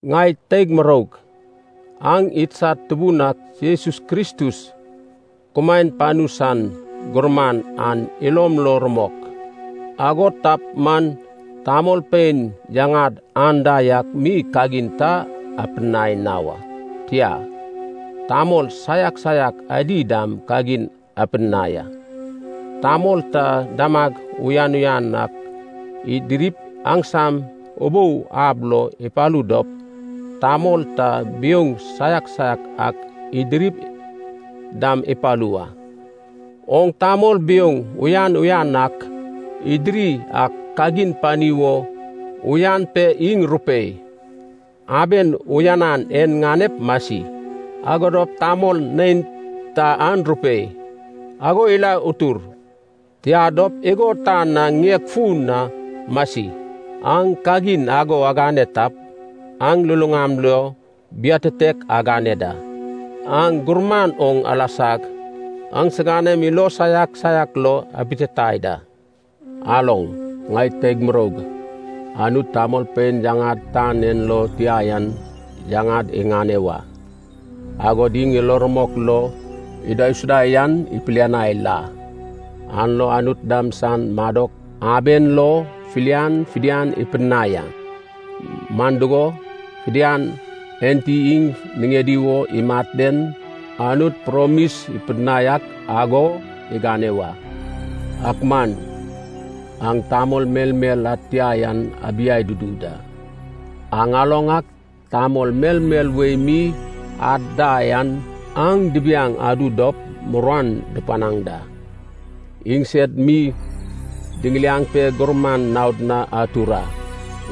Ŋai teig muroug aŋ idsad Tubun ak Jesus Kristus, kumaen panu san gurman an ilom lo rumok, ago tap man tamolpein yaŋad anda yak mi kagin ta apidinai na wa, tia, tamol saiak saiak adi dam kagin apidinai a. Tamol ta damag uyan uyan ak idirip aŋsam ubou ab lo ipalu dop, tamol ta biouŋ saiak saiak ak idirip dam ipalu wa. Oŋ tamol biouŋ uyan uyan ak idiri an kagin pani wo uyan pe iŋ rupei, “Aben uyanan en ŋanep masi,” ago dop tamol neinta an rupei, “Ago ila utur, tia dop igo tan na ŋieg fun na masi.” Aŋ kagin ago agane tap, aŋ luluŋam lo biatitek agane da. Aŋ gurman oŋ alasag aŋsiganem ilo saiak saiak lo abititai da. Aloŋ, ŋai teig muroug, Anut tamolpein yaŋad tan en lo tia yan yaŋad iŋane wa, agod iŋ ilo rumok lo idaisuda yan ipilianai la ya, an lo Anut dam san madok aben lo filian fidian ipidinai a. Man dugo, fidian enti iŋ niŋedi wo imat den, Anut promis ipidinai ak ago igane wa. Ak man aŋ tamol melmel ad tia yan abiai dudu da. Aŋ aloŋ ak tamol melmel wei mi ad da yan aŋ dibiaŋ adu dop muruan dupanaŋ da. Iŋsed mi diŋiliaŋ pe gurman naod na atur a.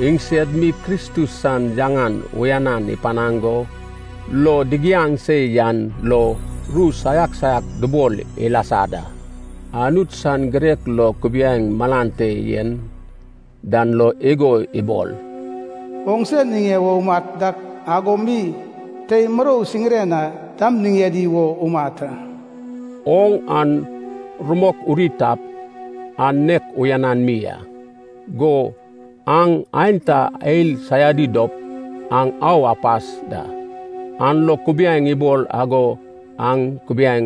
Iŋsed mi Kristus san yaŋan uyanan ipanaŋ go, lo digiaŋ se yan lo, ru saiak saiak dubol ilasa da. Anut san girek lo kubiaeŋ malan te yen dan lo igo ibol, “Oŋse niŋe wo umat dak ago mi, tei murou siŋire na dam niŋedi wo umat a.” Oŋ an rumok uri tap, an nek uyanan mi a. Go aŋ aenta ael saiadi dop, aŋ au apas da, an lo kubiaeŋ ibol ago aŋ kubiaeŋ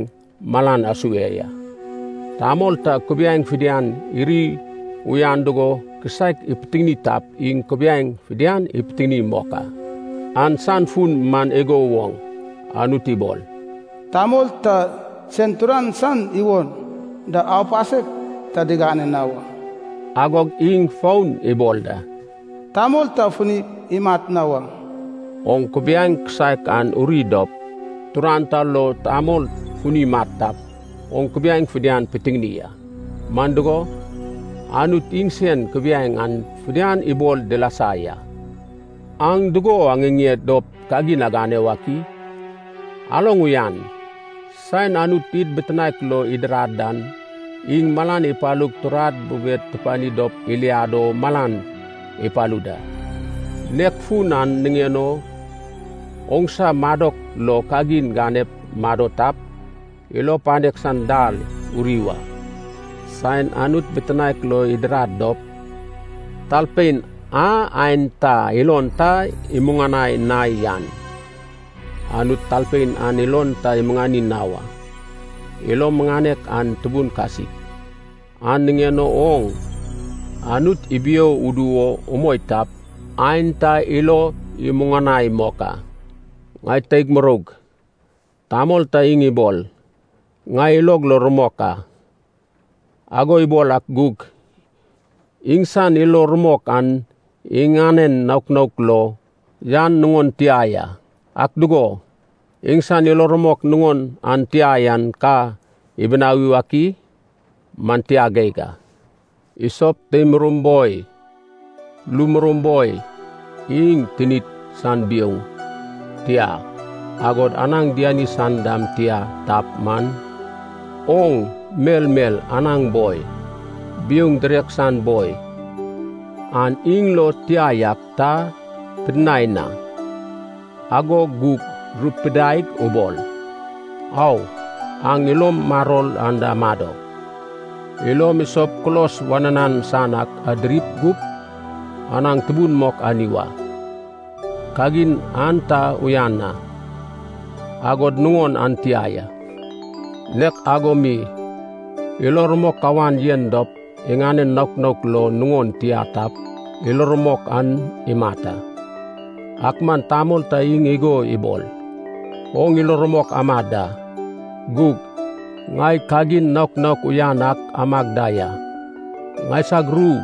malan asue ya. Tamol ta kubiaeŋ fidian iri uyan dugo kisaek ipitiŋini tap iŋ kubiaeŋ fidian ipitiŋini mok a. An san fun man igo woŋ. Anut ibol, “Tamol ta sen turan san iwon da aupasek ta digane na wa.” Agog iŋ fon ibol da, “Tamol ta fini imat na wa.” Oŋ kubiaeŋ kisaek an uri dop, turan ta lo tamol funi imat tap, oŋ kubiaeŋ fidian pitiŋini a. Man dugo, Anut iŋsen kubiaeŋ an fidian ibol dilasa ya. Aŋ dugo aŋiŋeŋ dop kagin agane wak i? Aloŋ uyan, saen Anut id bitinaek lo idirad an, iŋ malan ipalug turad bubed tupidinai dop iliad o malan ipalu da. Nek fun an niŋen o, oŋsa madok lo kagin ganep mado tap, ilo panek san dal uri wa. Saen Anut bitinaek lo idirad dop, talpein a aenta ilon ta imuŋanai na yan, Anut talpein an ilon ta imuŋani na wa. Ilo muŋanek an tubun kasik, an niŋen o oŋ Anut ibio udu wo umoi tap, aenta ilo imuŋanai mok a. Ŋai teig muroug, tamol ta iŋ ibol, ŋai ilog lo rumok a. Ago ibol ak gug, iŋsan ilo rumok an iŋanen naok naok lo yan nuŋon tia ya. Ak dugo, iŋsan ilo rumok nuŋon an tia yan ka ibinawi wak i? Man tia geig a. Isop tei murou boi, lu murou boi, iŋ tinid san biouŋ, tia, agod anaŋ diani san dam tia tap man, oŋ melmel anaŋ boi, biouŋ direk san boi, an iŋ lo tia yak ta pidinai na, ago gug rupidaig ubol, “Awo, aŋ ilom maror anda amado. Ilom isoup kulos wananan san ak adiri gup, anaŋ tubun mok ani wa.” Kagin an ta uyan na, agod nuŋon an tia ya. Nek ago mi, ilo rumok kawan yen dop iŋanen naok naok lo nuŋon tia tap, ilo rumok an imat a. Ak man tamol ta iŋ igo ibol, “Oŋ ilo rumok ama da, gug ŋai kagin naok naok uyan ak amag da ya.” Ŋaisag ru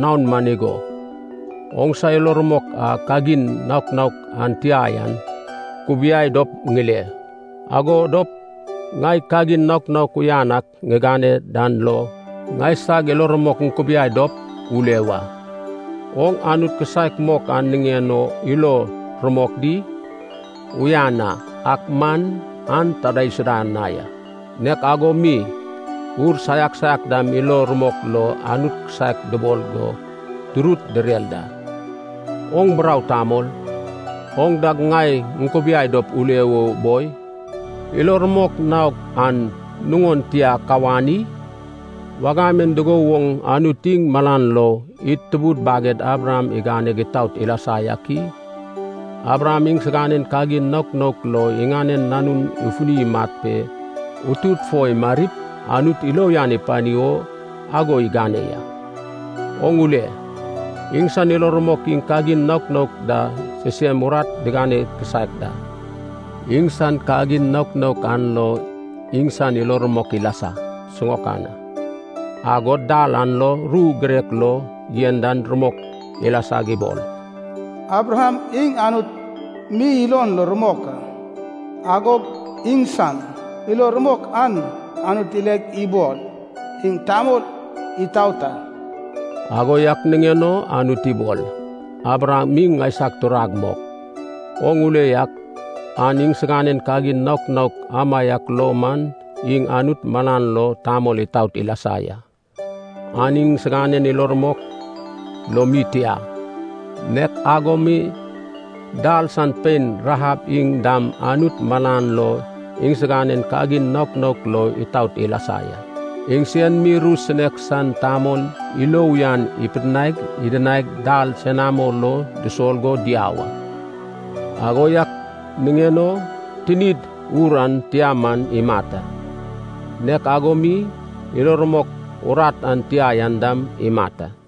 naon man igo, “Oŋsa ilo rumok a kagin naok naok an tia yan kubiai dop ŋile. Ago dop, ŋai kagin naok naok uyan ak ŋigane dan lo ŋaisag ilo rumok ŋukubiai dop ule wa.” Oŋ Anut kisaek mok an niŋen o ilo rumok di? Uyan a, ak man an ta idaisuda na ya. Nek ago mi ur saiak saiak dam ilo rumok lo Anut kisaek dubol go dirut direr da. Oŋ burau tamol! Oŋ dag ŋai ŋukubiai dop ule o boi, ilo rumok naok an nuŋon tia kawan i? Wagam en dugo woŋ Anut iŋ malan lo id tubud baged Abraham iganeg itaot ilasa yak i? Abraham iŋsiganen kagin naok naok lo iŋanen nanun ifuni imat pe utut fo imarip Anut ilo uyan ipani wo ago igane ya. Oŋ ule, iŋsan ilo rumok iŋ kagin naok naok da sisem urat digane kisaek da. Iŋsan kagin naok naok an lo iŋsan ilo rumok ilasa siŋaokan a. Agog dal an lo ru a girek lo yen dan rumok ilasag ibol, “Abraham iŋ Anut mi ilon lo rumok a, agog iŋsan ilo rumok an Anut ileg ibol, iŋ tamol itaot a.” Ago yak niŋen o Anut ibol, “Abraham iŋ ŋaisag turag mok.” Oŋ ule yak, an iŋsiganen kagin naok naok amaiak lo man iŋ Anut malan lo tamol itaot ilasa ya. An iŋsiganen ilo rumok lo mi tia ya. Nek ago mi dal san pein Rahab iŋ dam Anut malan lo iŋsiganen kagin naok naok lo itaot ilasa ya. Iŋsen mi ru sinek san tamol ilo uyan ipidinaig idinaig dal senamo lo dusol go diau a. Ago yak niŋen o tinid ur an tia man imat a, nek ago mi, ilo rumok urat an tia yan dam imat a.